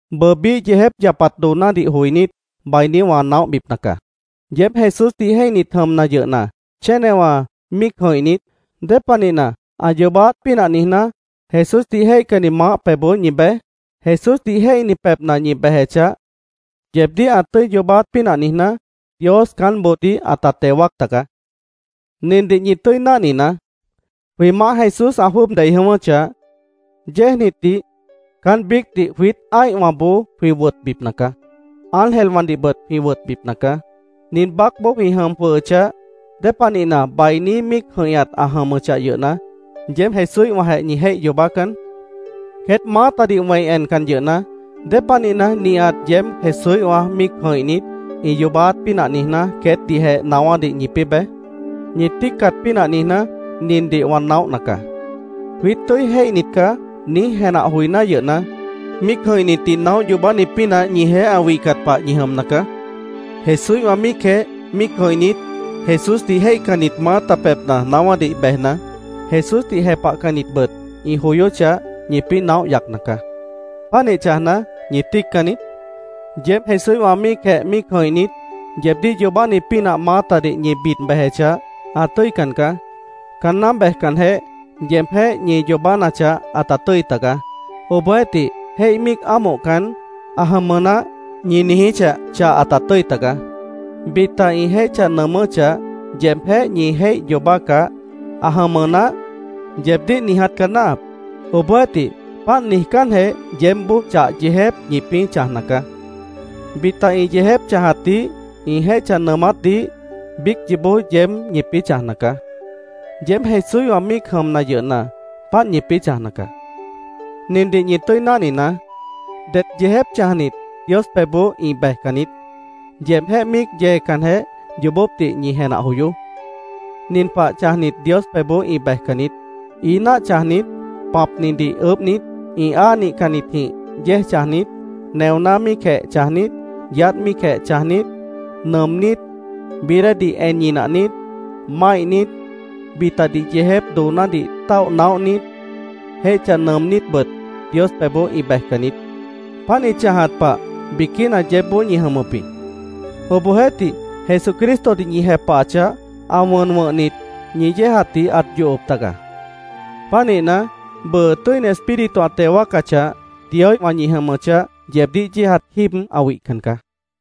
Bʉʉ biíh yeejép yapat doonádih joinít, bainí wã naóhbipna caá. Yeéb Jesúsdih jéihnit jʉmna yʉhna, chénewã míic jʉ̃ihnit, ¿Dépanihna, ã yoobáát pínah niijná, Jesúsdih jéihcanni maáh pebhboó ñi bej? Jesúsdih jéihni pebhna ñi bejechah, yeebdíh ã tʉ́i yoobáát pínah niijná, Dios caánboodíh ãta teo wáac taga. Nindih ñi tʉ́i náhninaá: Jwĩ Maáh Jesús ã jwʉ́ʉb dei jʉ̃ʉ́wʉ́chah, yéejnitdih caán biícdih jwiít ã́ihwãboó jwĩ wʉtbipna caá. Ángelwãdihbʉt jwĩ wʉtbipna caá. Nin baácboó jwĩ jʉm jwʉhʉchah, ¿Dépanihna, bainí míic jʉ̃ihñat ã jʉmʉchah yʉhna, yeéb Jesúíhwãjeh ñi jéih yoobácan? Queét maátadih wẽi encan yʉhna, ¿Dépanihna, nihat yeéb Jesúíhwã míic jʉ̃ihnit, ĩ yoobáát pínah niijná, queétdihjeh naáwádih ñipĩ́ bej? Ñi tíicat pínah niijná, nindih wã naóhna caá: “Jwiít tʉ́i jéihnit caá”, niíj jenah joiná yʉhna, míic jʉ̃ihnitdih naóh yoobáni pínah ñijeéh ã wihcat pah ñi jʉmna caá. Jesúíhwã míicjeh míic jʉ̃ihnit, Jesúsdih jéihcannit maáta pebhna naáwádih bejna, Jesúsdih jepahcannitbʉt ĩ joyóchah, ñipĩ́ naóh yacna caá. ¿Pánih chãjna, ñi tíiccan niít? Yeéb Jesúíhwã míicjeh míic jʉ̃ihnit, yeebdíh yoobáni pínah maátadih ñi bid bejechah, ã tʉ́ican caá. Caanná bejcanjeh, yeebjéh ñi yoobánachah, ãta tʉ́i tagaá. Obohjeéhtih, jéih míic ámohcan, “Ã jʉmʉ naáh”, ñi niijíchah, chah ãta tʉ́i tagaá. Bita ĩ jéih chãj nʉʉmʉ́chah, yeebjéh ñi jéih yoobácah, “Ã jʉmʉ naáh”, yeebdíh niiját caá náahap. Obohjeéhtih, páant niijcánjeh, yeébboó chah yeejép ñipĩ́ chãjna caá. Bita ĩ yeejép chãjatdih, ĩ jéih chãj nʉʉmátdih, biíc yoobó yeéb ñipĩ́ chãjna caá. Yeéb Jesúíhwã míic jʉmna yʉhna, páant ñipĩ́ chãjna caá. Nindih ñi tʉ́i náhninaá: Det yeejép chãjnit Dios pebhboó ĩ bejcan niít. Yeebjéh míic yeecanjeh, yoobópdih ñi jenah joyoó. Nin pah chãjnit, Dios pebhboó ĩ bejcan niít: ií náah chãjnit, pãpnidih ʉʉ́bhnit, ĩ áa nihcannitjĩh yéej chãjnit, neoná míicjeh chãjnit, yaádh míicjeh chãjnit, nʉʉmnít, bií déedih en ñinahnit, máihnit, bitadih yeejép doonádih táoh naóhnit, jéih chãj nʉʉmnítbʉt Dios pebhboó ĩ bejcan niít. Páant ĩ chãjat pah biquína yeébboó ñi jʉmʉp jĩ. Obohjeéhtih, Jesucristodih ñi jepahachah, ã wʉn wʉ̃hnit, ñi yéejatdih ãt yohop taga. Pánihna, bʉʉ, Tʉ́ini Espíritu ã teo wáacachah, Dioíhwã ñi jʉmʉchah, yeebdíh yéejat jíib ã wihcan caá.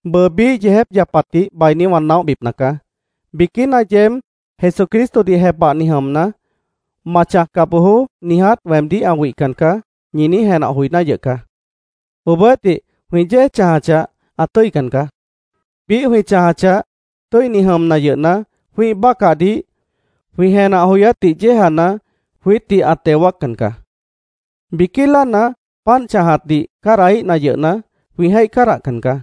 Bʉʉ biíh yeejép yapatdih bainí wã naóhbipna caá. Biquína yeéb “Jesucristodih jepahni jʉmna, ‘Ma chãjca bojoó’, niiját weemdíh ã wihcan caá”, ñi niíj jenah joiná yʉh caá. Obohjeéhtih, jwĩ yéej chãjachah, ã tʉ́ican caá. Biíh jwĩ chãjachah, tʉ́ini jʉmna yʉhna, jwĩ́ih bácahdih, jwĩ jenah joyátdih yéejana, jwiítdih ã teo wáaccan caá. Biquí láana, páant chãjatdih cádahíhna yʉhna, jwĩ jéih cádahcan caá.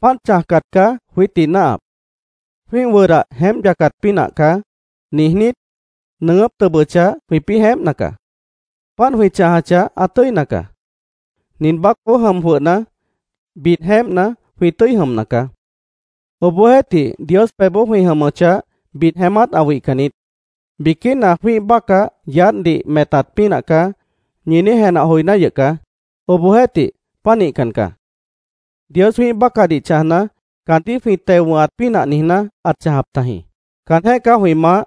Páant chãjcat caá jwiítdih náahap. “Jwĩ́ih wʉdah jeémp yacat pínah caá”, niijnít, nʉʉgʉ́p tʉbʉchah, jwĩpĩ́ jeémpna caá. Páant jwĩ chãjachah, ã tʉ́ina caá. Nin baácboó jʉm jwʉhna, bid jeémpna, jwĩ tʉ́i jʉmna caá. Obohjeéhtih, Dios pebhboó jwĩ jʉmʉchah, bid jeémát ã wihcan niít. Biquína “Jwĩ́ih bácah yaádhdih metat pínah caá”, ñi niíj jenah joiná yʉh caá. Obohjeéhtih, pánihcan caá. Dios jwĩ́ih bácahdih chãjna, caandíh jwĩ teo wʉ̃hat pínah niijná, ãt chãjap tajĩ. Caanjéh caá jwĩ Maáh.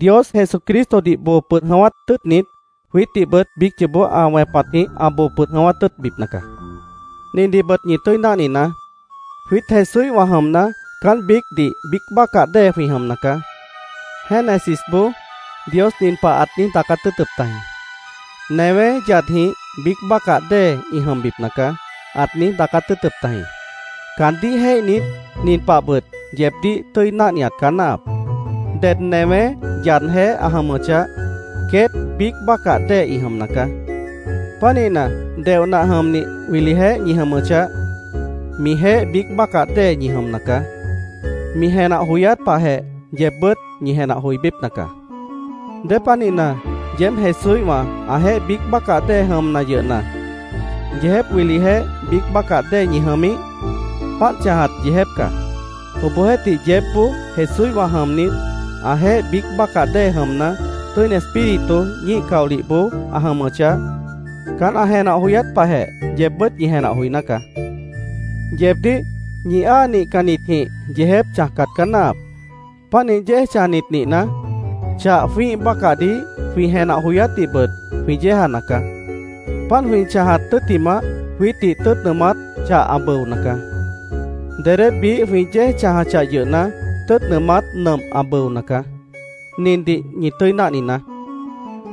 Dios Jesucristodih boo pʉd jʉ̃ʉ́wát tʉ́ʉtnit, jwiítdihbʉt biíc yoobó ã wẽpatjĩh ã boo pʉd jʉ̃ʉ́wát tʉ́ʉtbipna caá. Nindihbʉt ñi tʉ́i náhninaá: Jwiít Jesúíhwã jʉmna, caán biícdih biíc bácah dée jwĩ jʉmna caá. Génesisboó Dios nin pah ãt niíj daacát tʉ́ʉtʉp tajĩ: “Newé yadjĩh biíc bácah dée ĩ jʉmbipna caá”, ãt niíj daacát tʉ́ʉtʉp tajĩ. Caandíh jéihnit, nin pahbʉt yeebdíh tʉ́i náhniat caá náahap: Ded newé yadjeéh ã jʉmʉchah, queét biíc bácah dée ĩ jʉmna caá. Pánihna, deoh nah jʉmnih wilijeéh ñi jʉmʉchah, mijeéh biíc bácah dée ñi jʉmna caá. Mi jenah joyát pahjeh, yeebbʉ́t ñi jenah joibípna caá. ¿Dépanihna yeéb Jesúíhwã, ãjeéh biíc bácah dée jʉmna yʉhna, yeejép wilijeéh biíc bácah dée ñi jʉmíh? Páant chãjat yeejép caá. Obohjeéhtih yeébboó Jesúíhwã jʉmnit, ãjeéh biíc bácah dée jʉmna, Tʉ́ini Espíritu ñíih caolihboó ã jʉmʉchah, caán ã jenah joyát pahjeh yeebbʉ́t ñi jenah joiná caá. Yeebdíh ñi áa nihcannitjĩh yeejép chãjcat caá náahap. Pánih yéej chãjnit nihna, chah jwĩ́ih bácahdih, jwĩ jenah joyátdihbʉt jwĩ yéejana caá. Páant jwĩ chãjat tʉ́ttimah, jwiítdih tʉ́ʉt nʉʉmát chah ã bʉona caá. Dedé biíh jwĩ yéej chãjachah yʉhna, tʉ́ʉt nʉʉmát nʉmp ã bʉona caá. Nindih ñi tʉ́i náhninaá: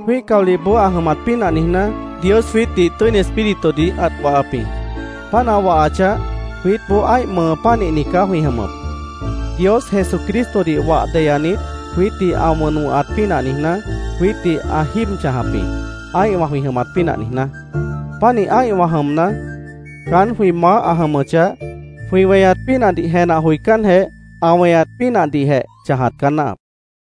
Jwĩ́ih caolihboó ã jʉmat pínah niijná, Dios jwiítdih Tʉ́ini Espíritudih ãt wahap jĩ. Páant ã wahachah, jwiítboó ã́ih mʉʉ pánihni caá jwĩ jʉmʉp. Dios Jesucristodih wah deyanit, jwiítdih ã wʉn wʉ̃hat pínah niijná, jwiítdih ã jíib chãjap jĩ, ã́ihwã jwĩ jʉmat pínah niijná. Pánih ã́ihwã jʉmna, caán jwĩ maáh ã jʉmʉchah, jwĩ weñat pínahdih jenah joicánjeh, ã weñat pínahdihjeh chãjat caá náahap.